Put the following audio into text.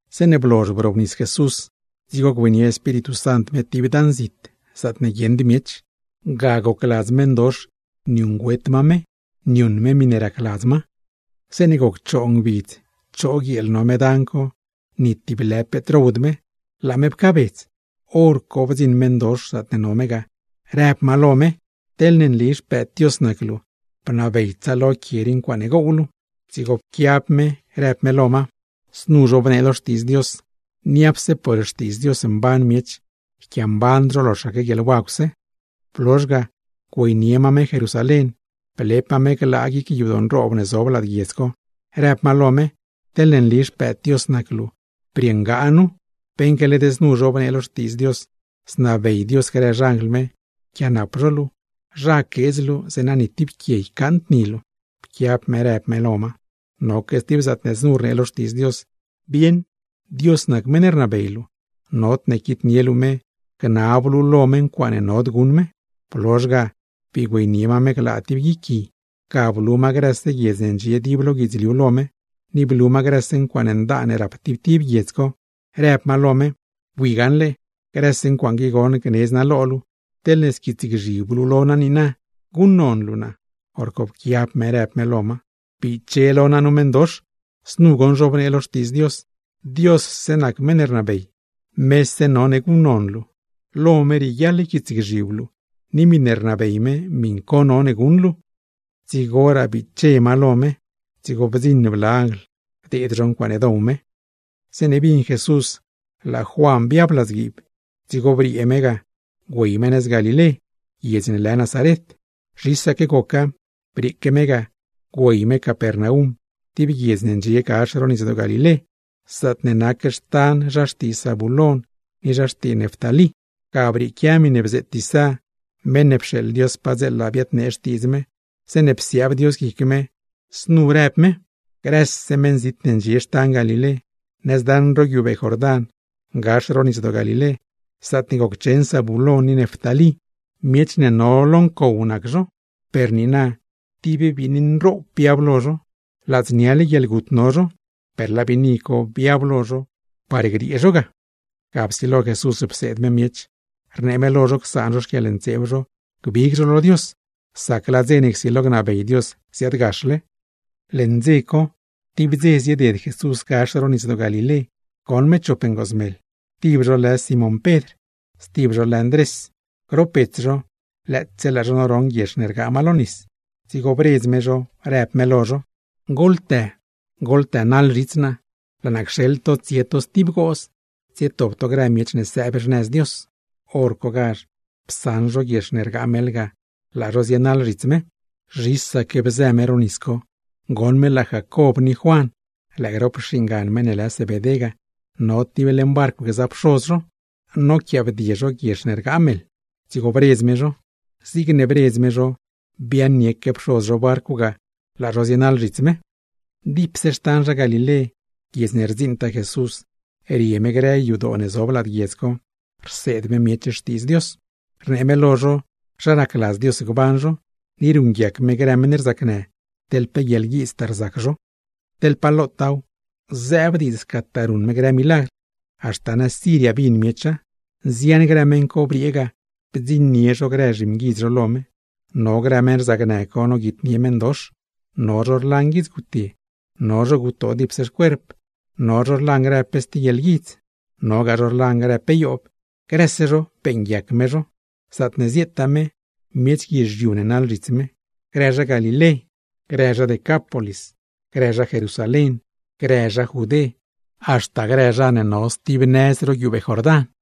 Zeeṉe blozh brobnis Jesús, dzigo güeynie Espíritu Sant me tib dan zit, zaatne guieṉd miech; ga gocladz meṉdox niuṉgüet ma me niuṉ me miṉe racladz ma. Zeeṉe goc choo ngbidz choo guieel no me dan co ni tib lë peet rowd me, laa me pcaabedz hor co bdziṉ meṉdox zaatne no me ga, rëb ma: ―Teḻne nli Xpëëd Dios nac luu, bnabey tsaalo grë quie rii ncuaaṉe gow luu. Dzigo pquiab me rëb me lo ma: ―Znu zhobnee lo Xtiidz Dios: “Niapse por xtiidz Dios mban miech, yquiamband zho loxaque guieḻwagwse.” Blozh ga güeynie ma me Jerusalén, blep ma me glaa guic yadoo nroob ne zob lad guiedz co, rëb ma lo me: ―Teḻne nli Xpëëd Dios nac luu, briṉgaa nu, beṉque led znu zhobnee lo Xtiidz Dios: “Znabey Dios grë xanjl me yquiaanap luu, zha queedz luu, zeeṉa ni tib quie ycaaṉd ni luu.” Pquiab me rëb me lo ma: ―Psoladz gaṉle, noque stib zaatne znu rnee lo Xtiidz Dios: “Bieṉ, Dios nac meṉ ne rnabey luu, nodne quitnie luu me gnab luu lo me ncuaaṉe nod guṉ me.” Blozh ga bii güeynie ma me glaa tib guic gui, ga blu ma grëse guiedz ne ndxie dib lo guidzliu lo me, ni blu ma grëse ncuaaṉ ndaan ne rap tib tib guiedz co, rëb ma lo me: ―Bui gaṉle, grëse ncuaaṉ qui goṉ gnedz naa lo luu teḻne squiitsgzhib luu lo naa niina, guṉnon luu naa. Horco pquiab me rëb me lo ma: ―¡Biche lo naa nu meṉdox! Znu goṉ zhobnee lo Xtiidz Dios: “Diosse nac meṉ ne rnabey, mese none guṉnon luu, lo me rieguiaḻ yquiitsgzhib luu; ni miṉe rnabey me miṉ co none guṉ luu.” Dzigoraa biche ma lo me, dzigo bdziṉ bla anjl bdeed zho ncuaaṉe dow me. Zeeṉe bin Jesús laa Juan biab ladzguiib, dzigo briee me ga güey me nëz Galilé, guiedz ne lë Nazaret. Zhisaque goca, brieeque me ga güey me Capernaum tib guiedz ne ndxie gax ro Nisdoo Galilé, zaatne nac xtan zha xtii Zabulón ni zha xtii Neftalí. Ga brieequia miṉe bzeet Isá (meṉ ne pxeeḻ Dios padzeela biadnee xtiidz me), zeeṉe psiaab Dios guic Isá rëb Isá: Grëse meṉzit ne ndxie xtan Galilé, nëz daṉ ro guiubee Jordán, gax ro Nisdoo Galilé, zaatne goccheṉ Zabulón ni Neftalí; miech ne no lo ncow nac zho, per niina tib biini nroob biab lo zho. Ladzniale guieḻgut no zho, per laa biini co biab lo zho par griee zho ga. Ga psilo Jesús pseed me miech, rnee me lo zho csaan zho xquieḻntseeb zho, gbig zho lo Dios, sac laa dze ne csilo gnabey Dios ziaadgaxle. Leṉ dze co, tib dze zieded Jesús gax ro Nisdoo Galilé goṉ me chop ngoozmeḻ, tib zho lë Simón Pedr, stib zho lë Ndrés; grop bets zho lëëtse laa zho noroṉ guiex ne rgaa meḻ lo nis. Dzigo bredz me zho, rëb me lo zho: ―¡Goḻtë goḻtënaḻ zhits naa! ¡Laa naa cxeḻ to tsie to stib gooz, tsietop to grë miech ne sëëb xnëz Dios! Horcogazh psaṉ zho guiex ne rgaa meḻ ga, laa zho zienaḻ zhits me. Zhisaque bzë me ro nis co, goṉ me laa Jacob ni Juan (lëë grop xingan meṉ ne lë Zebedé ga) no tib leṉ barcw gza pxoz zho, noquiaabdie zho guiex ne rgaa meḻ; dzigo bredz me zho. Zigne bredz me zho biaaṉnieque pxoz zho barcw ga, laa zho zienaḻ zhits me. Dipse xtan zha Galilé, guiedz ne rdziṉtaa Jesús rie me grë yadoo ne zob lad guiedz co rseed me miech Xtiidz Dios, rnee me lo zho zha racladz Dios gban zho, ni ruṉguiac me grë meṉ rzacnë, teḻ pe guieḻguiidztaa rzac zho. Teḻ pa lotaaw zëëb diidz scataa ruṉ me grë milagr, haxta nëz Siria bin miecha. Nzian grë meṉ co briee ga bdziṉnie zho grë zhimguidz zho lo me: no grë meṉ rzacnë co noguitnie meṉdox, no zho rlan guieḻguidz gutye, no zho gutoo dipse xcuerp, no zho rlan grë pe stib guieḻguidz, nogaa zho rlan grë pe yoob; grëse zho beeṉguiac me zho. Zaatne zieetaa me, miech guizhiu ne naḻ zhits me, grë zha Galilé, grë zha Decápolis, grë zha Jerusalén, grë zha Judé, haxta grë zha ne no stib nëz ro guiubee Jordán.